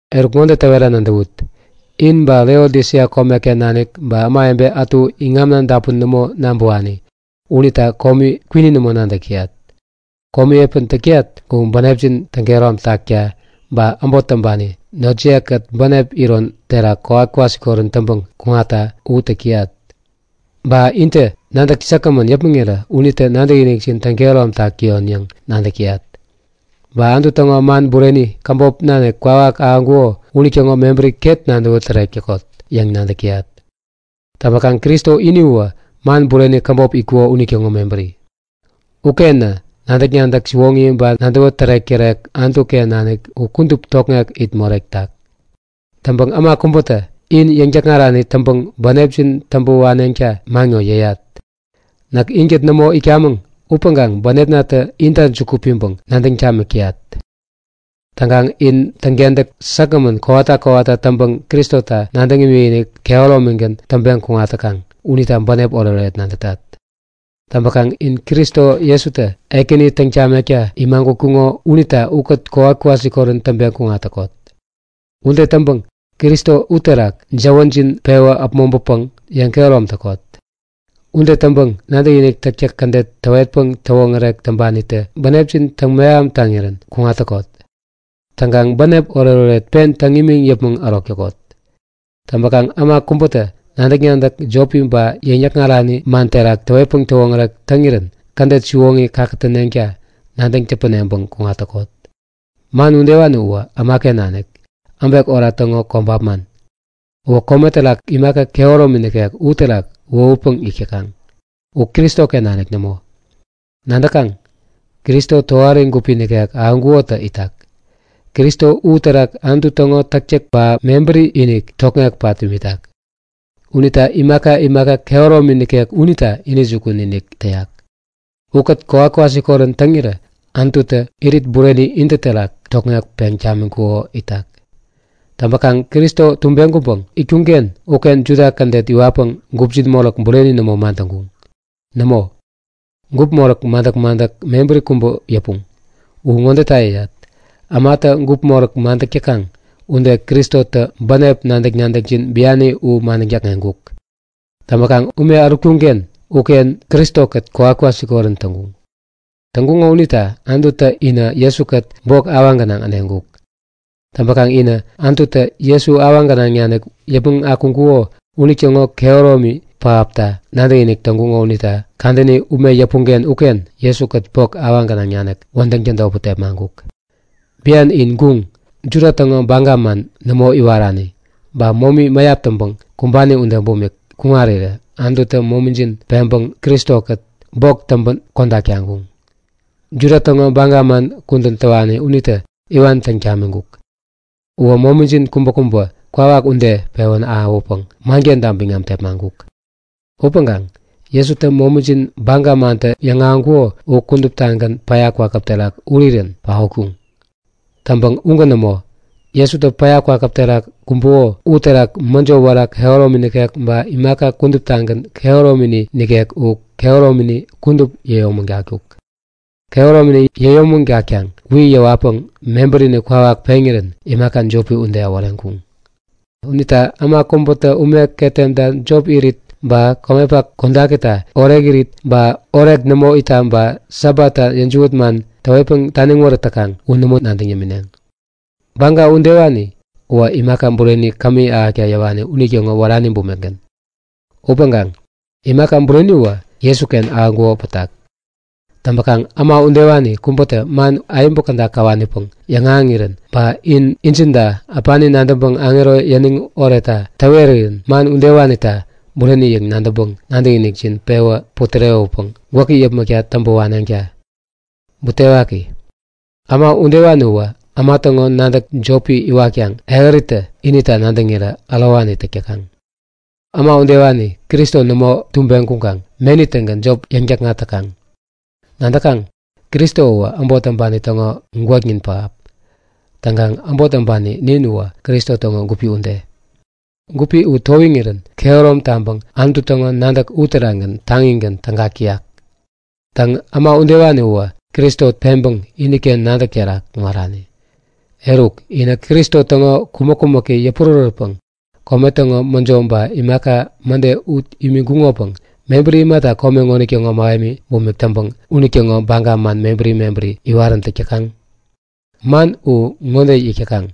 Eruk ŋode täwera nadäwut; In ba Laodisia komeken nanik ba ämawebe ätu iŋamna dapun nämo nabäwani, unita komi kwini nämo nadäk täyat. Komi epän täk täyat u bänepjin täŋkehärom takta ba äbot täŋpani notjiye-kät bänep iron terak kowat-kwasikorän täŋpäŋ kuŋatta u täk täyat. Ba intä nadäk säkgämän yäpmäŋirä unitä nadäkinikjin täŋ-kehäromtak täyon yäŋ nadäk täyat. Ba Anutu täŋo man bureni käbop nanik kwawak ahäŋkuko unitäŋo mebäri ket nadäwä tärek täkot yäŋ nadäk täyat. Täŋpäkaŋ Kristo ini uwä man bureni käbop itkuko unitäŋo mebäri. Ukenä nadäk-nadäk siwoŋi ba nadäwä tärek-tärek Anutu-ken nanik u kudup tokŋek it moretak. Täŋpäŋ äma kubätä in yäŋ-täkŋarani täŋpäŋ bänepjin täŋpä waneŋta man ŋowä yäyat. Näk inkät nämo itkamäŋ upäŋkaŋ bänepnatä inta juku piŋpäŋ nadäŋ tamik täyat. Täŋkaŋ in täŋkentäk säkgämän kowata kowata täŋpäŋ Kristota nadäŋ imikinik kehäromigän täŋpeŋ kuŋat täkaŋ unita bänep oretoret nadätat. Täŋpäkaŋ in Kristo Jesutä Ekäni täŋ tamekta imagutkuŋo unita ukät kowat-kwasikorän täŋpeŋ kuŋat täkot. Ude täŋpäŋ Kristo uterak jäwänjin pewä äpmoŋpänpäŋ yeŋkehärom täkot. Ude täŋpäŋ nadäkinik täktäk kädet täwetpäŋ täwoŋärek täŋpanitä bänepjin täŋmeham taŋirän kuŋat täkot. Täŋkaŋ bänep oretoret pen täŋ imiŋ yäpmäŋ ärok täkot. Täŋpäkaŋ äma kubätä nadäk-nadäk jopi ba yäŋ-yäkŋarani man terak täwetpäŋ täwoŋärek täŋirän kädet siwoŋi kakätäneŋta nadäŋ täpäneŋpäŋ kuŋat täkot. Man udewani uwä ämaken nanik, äbek ora täŋo kobap man. Uwä kome terak imaka kehäromi nikek uterak wohutpäŋ yäk täkaŋ, u Kristoken nanik nämo. Nadäkaŋ, Kristo tohari gupi nikek ahäŋkukotä itak. Kristo uterak Anutu täŋo täktäk ba mebäri-inik tokŋek pat imitak. Unitä imaka imaka kehäromi nikek unita intäjukun-inik täyak. Ukät kowat-kwasikorän täŋirä Anututä irit bureni intä terak tokŋek peŋ tamiŋkuko itak. Täŋpäkaŋ Kristo tubeŋ kuŋpäŋ itkuŋ-ken uken Juda kädet iwatpäŋ gupjin moräk bureni nämo madäŋkuŋ. Nämo, gup moräk madäk-madäk mebäri kubä yäpuŋ. U ŋodeta yäyat; Ämatä gupi moräk madäk täkaŋ ude, Kristotä bänep nadäk-nadäkjin biani u madäŋ däkŋeŋkuk. Täŋpäkaŋ ume ärutkuŋ-ken uken Kristo-kät kowat-kwasikorän täŋkuŋ. Täŋkuŋo unita Anututä inä Jesu-kät bok awaŋ gänaŋ äneŋkuk. Täŋpäkaŋ inä Anututä Jesu awaŋ gänaŋ nanik yäpmäŋ akuŋkuko unitäŋo kehäromi pähapta nadäkinik täŋkuŋo unita kadäni ume yäpuŋ-ken uken Jesu-kät bok awaŋ gänaŋ nanik wädäŋ tädotpäŋ tepmaŋkuk. Bian inä guŋ, Juda täŋo baga man nämo iwarani, ba momi mäyap täŋpäŋ kumbani ude bumik kuŋarirä Anututä momijin peŋpäŋ Kristo-kät bok täŋpän kodak taŋkuŋ. Juda täŋo baga man kudän täwani unitä iwan täŋ tamiŋkuk. Uwä momijin kubäkubä kwawak ude pewän ahäwäpäŋ mankenta biŋam tepmaŋkuk. Upäŋkaŋ Jesutä momijin baga mantä yäŋahäŋkuko u kuduptagän päya kwakäp terak urirän paotkuŋ. Täŋpäŋ ugän nämo; Jesutä päya kwakäp terak kumbuko uterak mäjo wära kehäromi nikek ba imaka kuduptagän kehäromini nikek u kehäromini kudup yäyomägatkuk. Kehäromini yäyomägatkaŋ wi yäwatpäŋ mebärini kwawak peŋirän imaka jopi ude äworeŋkuŋ. Unita äma kubätä ume ketemta jop irit ba komepak kodakita orekirit ba orek nämo itta ba Sabatta yäjiwät man täwetpäŋ taniŋ wärät täkaŋ u nämo nadäŋ imineŋ. Baga udewani uwä imaka bureni kämi ahäkta yäwani unitäŋo wärani bumikgän. Upäŋkaŋ imaka bureniwä Jesuken ahäŋkuko pätak. Täŋpäkaŋ äma udewani kubätä man ayäbu käda käwanipäŋ yäŋahäŋirän ba in injinta äpani nadäŋpäŋ aŋero yäniŋ oretta täwerirän man udewanita bureni yäŋ nadäŋpäŋ nadäkinikjin pewä putärewäpäŋ gwäki yäpmäkta täŋpä waneŋta. Butewaki, äma udewani uwä äma täŋo nadäk jopi iwatkaŋ ehäritä inita nadäŋirä ärowani täk täkaŋ. Äma udewani Kristo nämo tubeŋ kuŋkaŋ meni-tägän jop yäŋ-täkŋat täkaŋ. Nadäkaŋ? Kristo uwä äbot täŋpani täŋo gwäknin pähap. Täŋkaŋ äbot täŋpani nin uwä Kristo täŋo gupi ude. Gupi u towiŋirän kehärom taŋpäŋ Anutu täŋo nadäk uterakgän taŋigän tägak täyak. Täŋ, äma udewani uwä Kristo peŋpäŋ iniken nadäk terak kuŋarani. Eruk, inä Kristo täŋo kumäk-kumäki yäpurärätpäŋ kome täŋo mäjo ba imaka mäde ut yämiŋkuŋopäŋ mebäri imata kome ŋonitäŋo mähemi bumik täŋpäŋ unitäŋo baga man mebäri mebäri iwaräntäk täkaŋ? Man u ŋode yäk täkaŋ;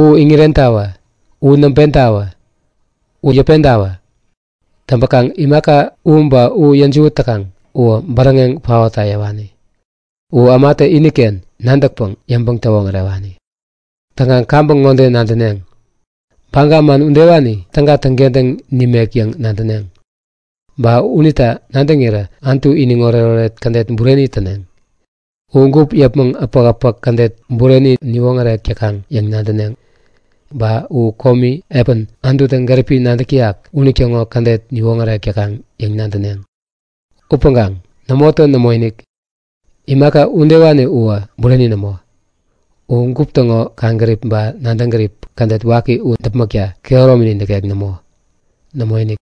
U iŋirentawä! U naŋpentawä! U yäpentawä! Täŋpäkaŋ imaka u ba u yäjiwät täkaŋ uwä bäräŋeŋ paotta yäwani. U ämatä iniken nadäkpäŋ yäŋpäŋ-täwoŋärewani. Täŋkaŋ kaŋpäŋ ŋode nadäneŋ; Baga man udewani täga täŋkentäŋ nimek yäŋ nadäneŋ. Ba unita nadäŋirä Anutu iniŋ oretoret kädet bureni täneŋ. U gup yäpmäŋ äpäk-äpäk kädet bureni niwoŋärek täkaŋ yäŋ nadäneŋ. Ba u komi epän Anututä gäripi nadäk täyak unitäŋo kädet niwoŋärek täkaŋ yäŋ nadäneŋ. Upäŋkaŋ nämotä nämoinik! Imaka udewani uwä bureni nämo. Uwä gup täŋo kaŋgärip ba nadäŋ gärip kädet waki u däpmäkta kehäromini nikek nämo. Nämoinik!